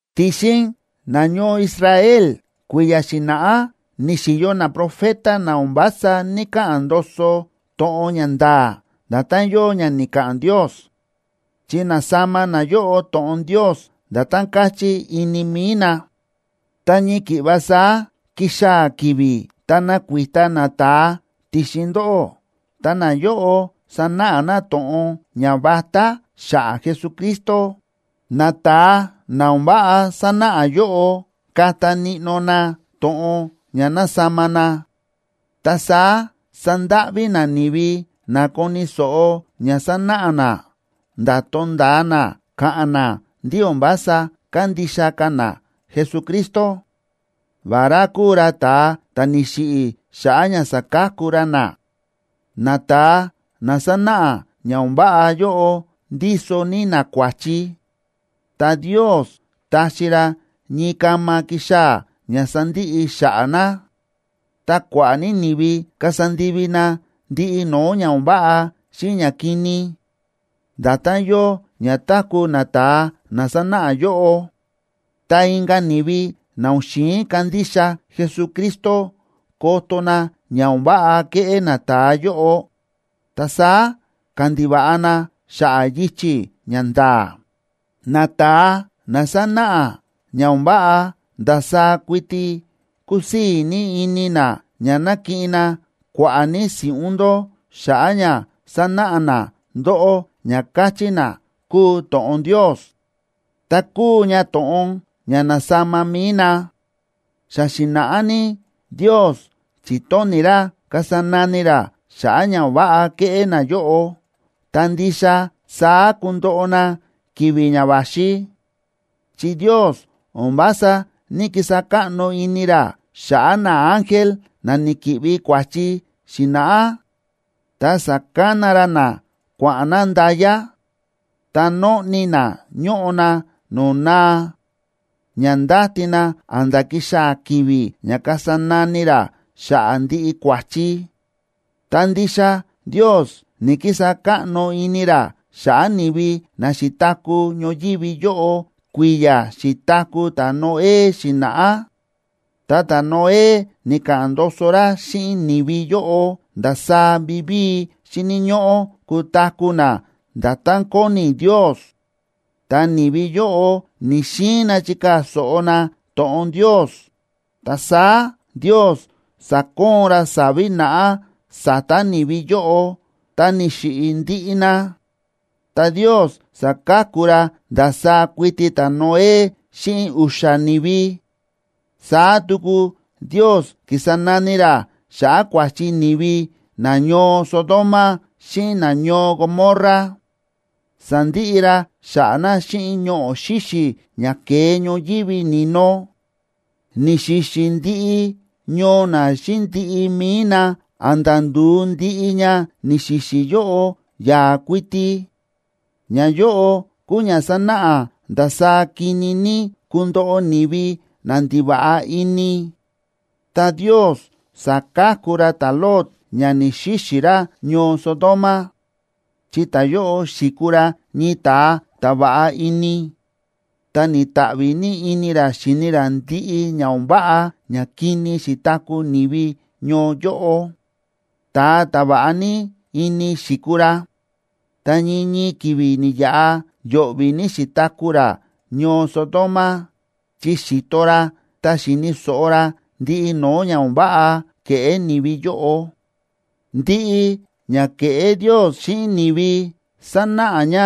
Ti̱xin nañoo Israel kui̱ya̱ xi̱na̱ꞌá ni̱xi̱yo naprofeta na o̱n vása ní‑kaꞌa̱n ndoso to̱ꞌon ña nda̱a̱ nda̱tán yóo ña ni̱ka̱ꞌa̱n Ndios, chi na̱sama nayóꞌo to̱ꞌon Ndios nda̱tán káchí ini mi̱i na. Ta ñii ki̱ꞌva saá kixaa̱ ki̱vi̱ ta nakuita nata̱a ti̱xin ndóꞌó, ta nayóꞌo sanáꞌa na to̱ꞌon ñavatá xa̱ꞌa̱ Jesucristo. Nata̱a na o̱n váꞌa sánáꞌa yóꞌo kata níꞌnó na to̱ꞌon ña na̱sama na, ta saá sandáꞌví na ni̱vi na koni̱ so̱ꞌo ña sanáꞌa na, nda̱ tonda̱a na ka̱ꞌa̱n na ndí o̱n vása kándixa ka̱ na Jesucristo, vará kúu ra ta̱a ta̱ ni̱xiꞌi̱ xa̱ꞌa̱ ña sa̱ka̱ku ra na. Nata̱a na sánáꞌa ña o̱n váꞌa yóꞌo ndíso ní na kua̱chi, ta Ndios taxi ra ñii kama kixaa̱ ña sandiꞌi xa̱ꞌa̱ na. Ta kua̱ꞌa̱ ní ni̱vi kasa ndivi na ndiꞌi no̱o̱ ña o̱n váꞌa xíꞌin ñakini, nda̱tán yóo ña táku̱ nata̱a na sánáꞌa yóꞌo. Ta inka̱ ni̱vi na o̱n xi̱in kandixa Jesucristo koto na ña o̱n váꞌa kéꞌé nata̱a yóꞌo, ta saá ka̱ꞌa̱n ndiva̱ꞌa na xa̱ꞌa̱ yichi̱ ña nda̱a̱. Nata̱a na sánáꞌa ña o̱n váꞌa ndasaá kuiti kúsii̱ ní ini na ña nakiꞌin na kua̱ꞌa̱ ní si̱ꞌún ndó xa̱ꞌa̱ ña sánáꞌa na ndóꞌó ña káchí na kúu to̱ꞌon Ndios, ta kúu ña to̱ꞌon ña na̱sama mi̱i na. Xa xi̱na̱ꞌá ní Ndios chi̱tóni̱ ra kasa nani ra xa̱ꞌa̱ ña o̱n váꞌa kéꞌé nayóꞌo, ta ndixa saá kundoꞌo na ki̱vi̱ ña va̱xi. Chi Ndios o̱n vása ní‑kisa káꞌno ini ra xa̱ꞌa̱ naángel na ni̱ki̱ꞌvi kua̱chi xi̱na̱ꞌá, ta sa̱kana ra na kua̱ꞌa̱n na nda̱ya, ta nóꞌni na ñóꞌo na no̱o̱ naa, ña ndáti na a̱nda̱ kixaa̱ ki̱vi̱ ña kasa nani ra xa̱ꞌa̱ ndiꞌi kua̱chi. Ta ndixa Ndios ni̱‑kisa káꞌno ini ra xa̱ꞌa̱ ni̱vi na xi̱taku̱ ñoyívi yóꞌo kui̱ya̱ xi̱taku̱ ta̱Noé xi̱na̱ꞌá. Ta ta̱Noé ni̱ka̱ꞌa̱n ndoso ra xíꞌin ni̱vi yóꞌo ndasaá vivíi xíni̱ ñóꞌó kutaku̱ na nda̱tán kóni Ndios. Ta ni̱vi yóꞌo ni̱‑xiin na chikaa̱ so̱ꞌo na to̱ꞌon Ndios, ta saá Ndios sa̱koon ra sa̱vi̱ naꞌá sa̱ta̱ ni̱vi yóꞌo, ta ni̱xiꞌi̱ ndiꞌi na, ta Ndios sa̱ka̱ku ra ndasaá kuiti ta̱Noé xíꞌin u̱xa̱ ni̱vi. Saá tuku Ndios ki̱sa nani ra xa̱ꞌa̱ kua̱chi ni̱vi nañoo Sodoma xíꞌin nañoo Gomorra, sa̱ndiꞌi ra xa̱ꞌa̱ na xíꞌin ñoꞌo̱ xíxi̱ ña ke̱e ñoyívi ni̱no, ni̱xi̱xi̱ ndiꞌi ñoo na xíꞌin ndiꞌi mi̱i na a̱nda̱ ndu̱u ndiꞌi ña ni̱xi̱xi̱ yóꞌo yaa̱ kuiti. Ñayóꞌo kúu ña sánáꞌa ndasaá kini ní kundoꞌo ni̱vi na ndiva̱ꞌa ini. Ta Ndios sa̱ka̱ku ra ta̱Lot ña ni̱‑xixi̱ ra ñoo Sodoma, chi ta̱yóꞌo xi̱kuu ra ñii ta̱a ta̱ va̱ꞌa ini, ta ni̱ta̱ꞌvi̱ ní ini ra xíni ra ndiꞌi ña o̱n váꞌa ñakini xi̱taku̱ ni̱vi ñoo yóꞌo. Ta̱a ta̱ va̱ꞌa ní ini xi̱kuu ra, ta ñii ñii ki̱vi̱ ni̱yaꞌa yo̱ꞌvi̱ ní xi̱taku̱ ra ñoo Sodoma, chi xi̱to ra ta xi̱ni̱ so̱ꞌo ra ndiꞌi no̱o̱ ña o̱n váꞌa kéꞌé ni̱vi yóꞌo. Ndiꞌi ña kéꞌé Ndios xíꞌin ni̱vi sánáꞌa ña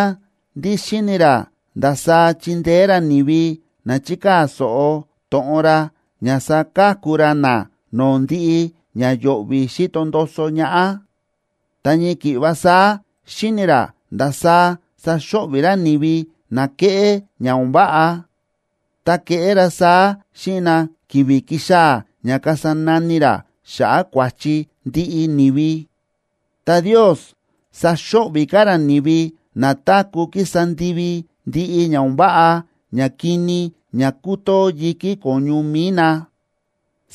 ndí xíni̱ ra ndasaá chindeé ra ni̱vi na chíkaa̱ so̱ꞌo to̱ꞌon ra, ña saka̱ku ra na no̱o̱ ndiꞌi ña yo̱ꞌvi̱ xíto ndoso ñaꞌá. Ta ñii ki̱ꞌva saá, xíni̱ ra ndasaá saxo̱ꞌvi̱ ra ni̱vi na kéꞌé ña o̱n váꞌa, ta keꞌé ra saá xíꞌin na ki̱vi̱ kixaa̱ ña kasa nani ra xa̱ꞌa̱ kua̱chi ndiꞌi ni̱vi. Ta Ndios saxo̱ꞌvi̱ ka̱ ra ni̱vi na táku̱ kísa ndivi ndiꞌi ña o̱n váꞌa ñakini ña kútoo yi̱kí ko̱ñu mi̱i na,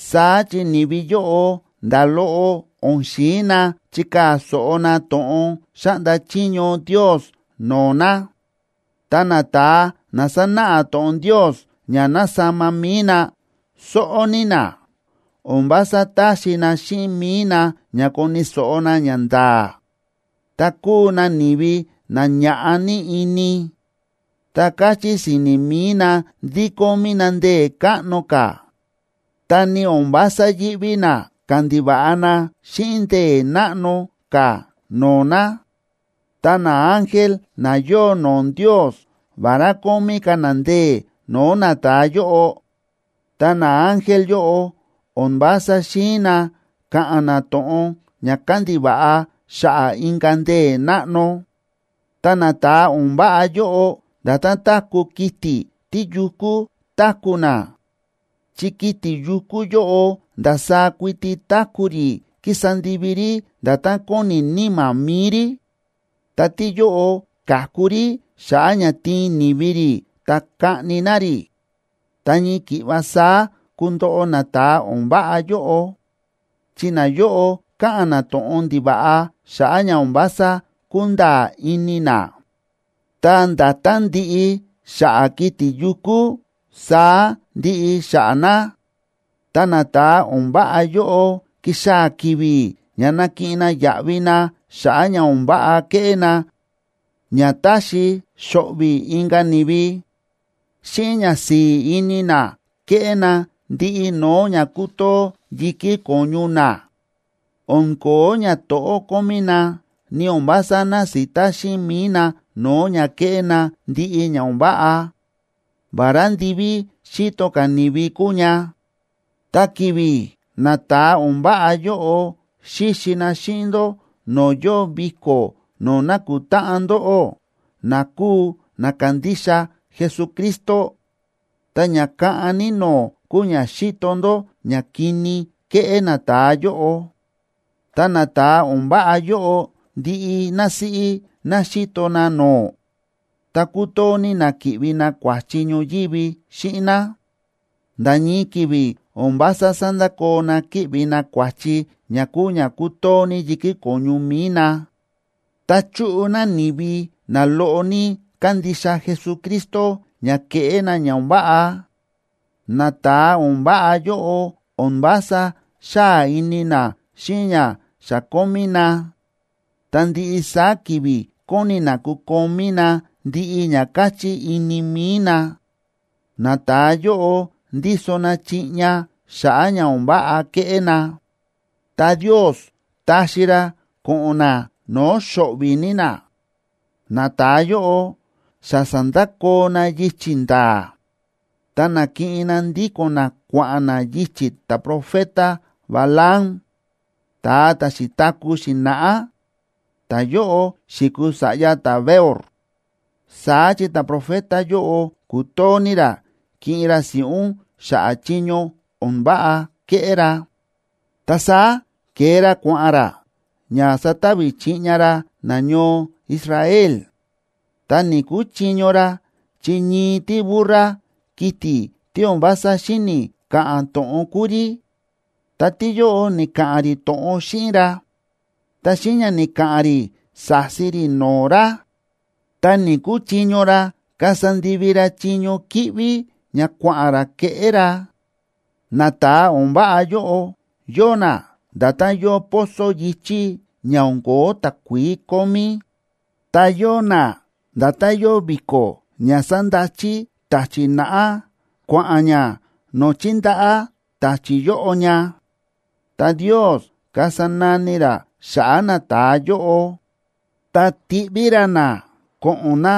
saá chi ni̱vi yóꞌo nda̱ loꞌo o̱n xi̱in na chikaa̱ so̱ꞌo na to̱ꞌon xáꞌnda chiño Ndios no̱o̱ na. Ta nata̱a na sánáꞌa to̱ꞌon Ndios ña na̱sama mi̱i na, sóꞌó ní na, o̱n vása táxi na xíꞌin mi̱i na ña koni̱ so̱ꞌo na ñanda̱a̱. Ta kúu na ni̱vi na ña̱ꞌa ní ini, ta káchí si̱ni̱ mi̱i na ndí kómí na ndee̱ káꞌno ka̱, ta ni o̱n vása yíꞌví na kándiva̱ꞌa na xíꞌin ndee̱ náꞌno ka̱ no̱o̱ na. Ta naángel, na yóo no̱o̱ Ndios, vará kómí ka̱ na ndee̱ no̱o̱ nata̱a yóꞌo, ta naángel yóꞌo o̱n vása xi̱in na ka̱ꞌa̱n na to̱ꞌon ña kandiva̱ꞌa xa̱ꞌa̱ inka̱ ndee̱ náꞌno. Ta nata̱a o̱n váꞌa yóꞌo nda̱tán táku̱ kiti̱ tíyukú táku̱ na, chi kiti̱ yukú yóꞌo ndasaá kuiti táku̱ rí kísa ndivi rí nda̱tán kóni níma̱ mi̱i rí. Ta tíyóꞌo ka̱ku rí xa̱ꞌa̱ ña tiin ni̱vi rí ta kaꞌni na rí. Ta ñii ki̱ꞌva saá kundoꞌo nata̱a o̱n váꞌa yóꞌo, chi nayóꞌo káꞌa̱n na to̱ꞌon ndiva̱ꞌa xa̱ꞌa̱ ña o̱n vása kúnda̱a̱ ini na, ta nda̱tán ndiꞌi xa̱ꞌa̱ kiti̱ yukú, saá ndiꞌi xa̱ꞌa̱ na. Ta nata̱a o̱n váꞌa yóꞌo, kixaa̱ ki̱vi̱ ña nakiꞌin na yaꞌvi na xa̱ꞌa̱ ña o̱n váꞌa kéꞌé na ña táxi xo̱ꞌvi̱ inka̱ ni̱vi. Xíꞌin ñasi̱i̱ ini na kéꞌé na ndiꞌi no̱o̱ ña kútoo yi̱kí ko̱ñu na, o̱n ko̱ó ñato̱ꞌó kómí na, ni o̱n vása násita xíꞌin mi̱i na no̱o̱ ña kéꞌé na ndiꞌi ña o̱n váꞌa, vará ndiví xíto ka̱ ni̱vi kúu ña. Ta ki̱vi̱ nata̱a o̱n váꞌa yóꞌo xíxi na xíꞌin ndó no̱o̱ yóo viko̱ no̱o̱ nákutáꞌan ndóꞌó na kúu na kándixa Jesucristo, ta ña kaꞌan ní no̱o̱ kúu ña xíto ndó ñakini kéꞌé nata̱a yóꞌo. Ta nata̱a o̱n váꞌa yóꞌo, ndiꞌi násíꞌí ná xíto na no̱o̱, ta kútoo ní na ki̱ꞌvi na kua̱chi ñoyívi xíꞌin ná. Nda̱ ñii ki̱vi̱ o̱n vása sándakoo na kíꞌvi na kua̱chi ña kúu ña kútoo ní yi̱kí ko̱ñu mi̱i na. Ta chúꞌu na ni̱vi na loꞌo ní kándixa Jesucristo ña kéꞌé na ña o̱n váꞌa. Nata̱a o̱n váꞌa yóꞌo o̱n vása xáa ini na xíꞌin ña xa kómí na, ta ndiꞌi saá ki̱vi̱ kóni na kukomí na ndiꞌi ña káchí ini mi̱i na. Nata̱a yóꞌo ndíso na chiꞌña xa̱ꞌa̱ ña o̱n váꞌa kéꞌé na, ta Ndios taxi ra ko̱ꞌo̱n na no̱o̱ xo̱ꞌvi̱ ní na. Nata̱a yóꞌo xa sa̱ndakoo na yichi̱ nda̱a̱, ta na̱kiꞌin na ndíko̱n na kua̱ꞌa̱n na yichi̱ ta̱profeta Balaam ta̱a ta̱ xi̱taku̱ xi̱na̱ꞌá, ta̱yóꞌo xi̱kuu sa̱ꞌya ta̱Beor. Saá chi ta̱profeta yóꞌo ku̱too ní ra kiꞌin ra si̱ꞌún xa̱ꞌa̱ chiño o̱n váꞌa ke̱ꞌé ra. Ta saá ke̱e ra kua̱ꞌa̱n ra ña satavi chiꞌña ra nañoo Israel, ta ni̱‑kuchiño ra, chi ñii tíburra, kiti̱ tí o̱n vása xíni̱ ka̱ꞌa̱n to̱ꞌon kúu rí, ta tíyóꞌo ni̱ka̱ꞌa̱n rí to̱ꞌon xíꞌin ra, ta xíꞌin ña ni̱ka̱ꞌa̱n rí sa̱si rí no̱o̱ ra, ta ni̱‑kuchiño ra kasa ndivi ra chiño kíꞌví ña kua̱ꞌa̱n ra keꞌé ra. Nata̱a o̱n váꞌa yóꞌo yóo na nda̱tán yóo pozo yi̱chí ña o̱n ko̱ó takuií kómí, ta yóo na nda̱tán yóo vi̱ko̱ ña sándachi ta̱chi̱ naꞌá kua̱ꞌa̱n ña no̱o̱ chíndaꞌá ta̱chi̱ yóꞌo ña. Ta Ndios kasa nani ra xa̱ꞌa̱ nata̱a yóꞌo, ta tiꞌví ra na ko̱ꞌo̱n na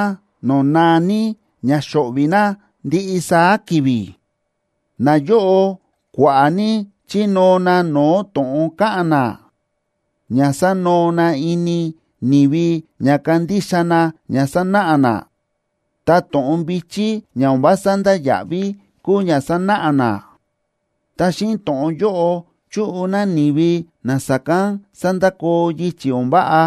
no̱o̱ naa ní ña xo̱ꞌvi̱ na ndiꞌi saá ki̱vi̱. Nayóꞌo kua̱ꞌa̱ ní chínóo na no̱o̱ to̱ꞌon káꞌa̱n na, ña sanoo na ini ni̱vi ña kandixa na ña sánáꞌa na, ta to̱ꞌon vi̱chí ña o̱n vása ndáya̱ꞌví kúu ña sánáꞌa na. Ta xíꞌin to̱ꞌon yóꞌo chúꞌu na ni̱vi na sa̱kán sa̱ndakoo yichi̱ o̱n váꞌa,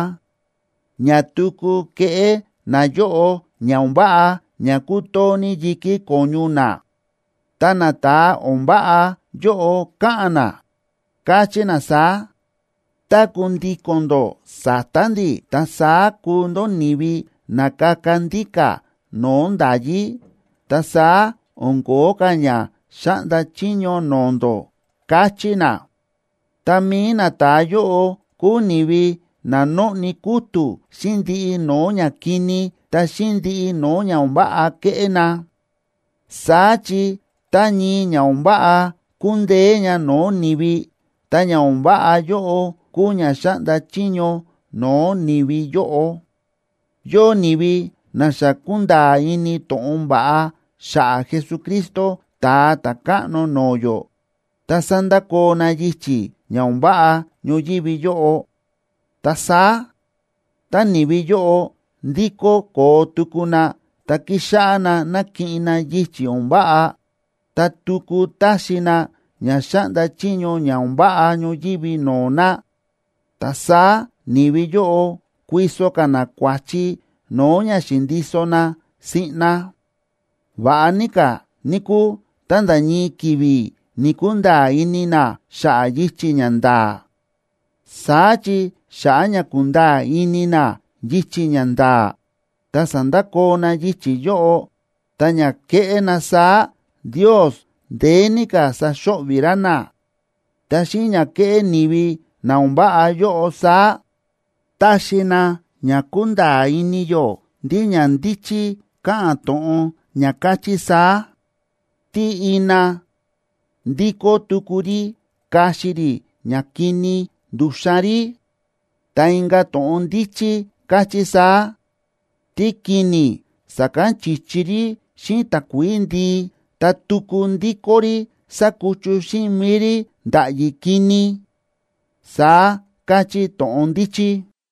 ña tuku kéꞌé nayóꞌo ña o̱n váꞌa ña kútoo ní yi̱kí ko̱ñu na. Ta nata̱a o̱n váꞌa yóꞌo káꞌa̱n na, káchí na saá: “Tá kundíko̱n ndó sa̱ta̱ ndi̱, ta saá kuu ndó ni̱vi na kaka ndíka̱ no̱o̱ nda̱yí, ta saá o̱n ko̱ó ka̱ ña xáꞌnda chiño no̱o̱ ndó”, káchí na. Ta mi̱i nata̱a yóꞌo kúu ni̱vi na nóꞌni kútu̱ xíꞌin ndiꞌi no̱o̱ ñakini ta xíꞌin ndiꞌi no̱o̱ ña o̱n váꞌa kéꞌé na. Saá chi tá ñii ña o̱n váꞌa kúndeé ña no̱o̱ ni̱vi, ta ña o̱n váꞌa yóꞌo kúu ña xáꞌnda chiño no̱o̱ ni̱vi yóꞌo. Yóo ni̱vi na xa ku̱nda̱a̱ ini to̱ꞌon va̱ꞌa xa̱ꞌa̱ Jesucristo Ta̱a Ta̱káꞌno no̱o̱ yó ta sa̱ndakoo na yichi̱ ña o̱n váꞌa ñoyívi yóꞌo. Ta saá, tá ni̱vi yóꞌo ndikó koo tuku na ta kixáꞌá na nakiꞌin na yichi̱ o̱n váꞌa, ta tuku taxi na ña xáꞌnda chiño ña o̱n váꞌa ñoyívi no̱o̱ na, ta saá ni̱vi yóꞌo kuiso ka̱ na kua̱chi no̱o̱ ña xi̱ndiso na siꞌna. Va̱ꞌa ní ka̱, níkúu, tá nda̱ ñii ki̱vi̱ ni̱‑kunda̱a̱ ini na xa̱ꞌa̱ yichi̱ ña nda̱a̱, saá chi xa̱ꞌa̱ ña ku̱nda̱a̱ ini na yichi̱ ña nda̱a̱, ta sa̱ndakoo na yichi̱ yóꞌo, ta ña ke̱ꞌé na saá Ndios ndeé ní ka̱ saxo̱ꞌvi̱ ra na. Ta xíꞌin ña ke̱ꞌé ni̱vi na o̱n váꞌa yóꞌo saá, táxi na ña kunda̱a̱ ini yó ndí ña ndíchí káꞌa̱n to̱ꞌon ña káchí saá: “Tí ina ndíkó tuku rí kaxi rí ñakini ndu̱xan rí.” Ta inka̱ to̱ꞌon ndíchí káchí saá: “Tíkini̱ sa̱kán chi̱chi rí xíꞌin takuií ndii, ta tuku ndíkó rí sakuchu xíꞌin mi̱i rí nda̱ꞌyi̱ kini”, saá káchí to̱ꞌon ndíchí.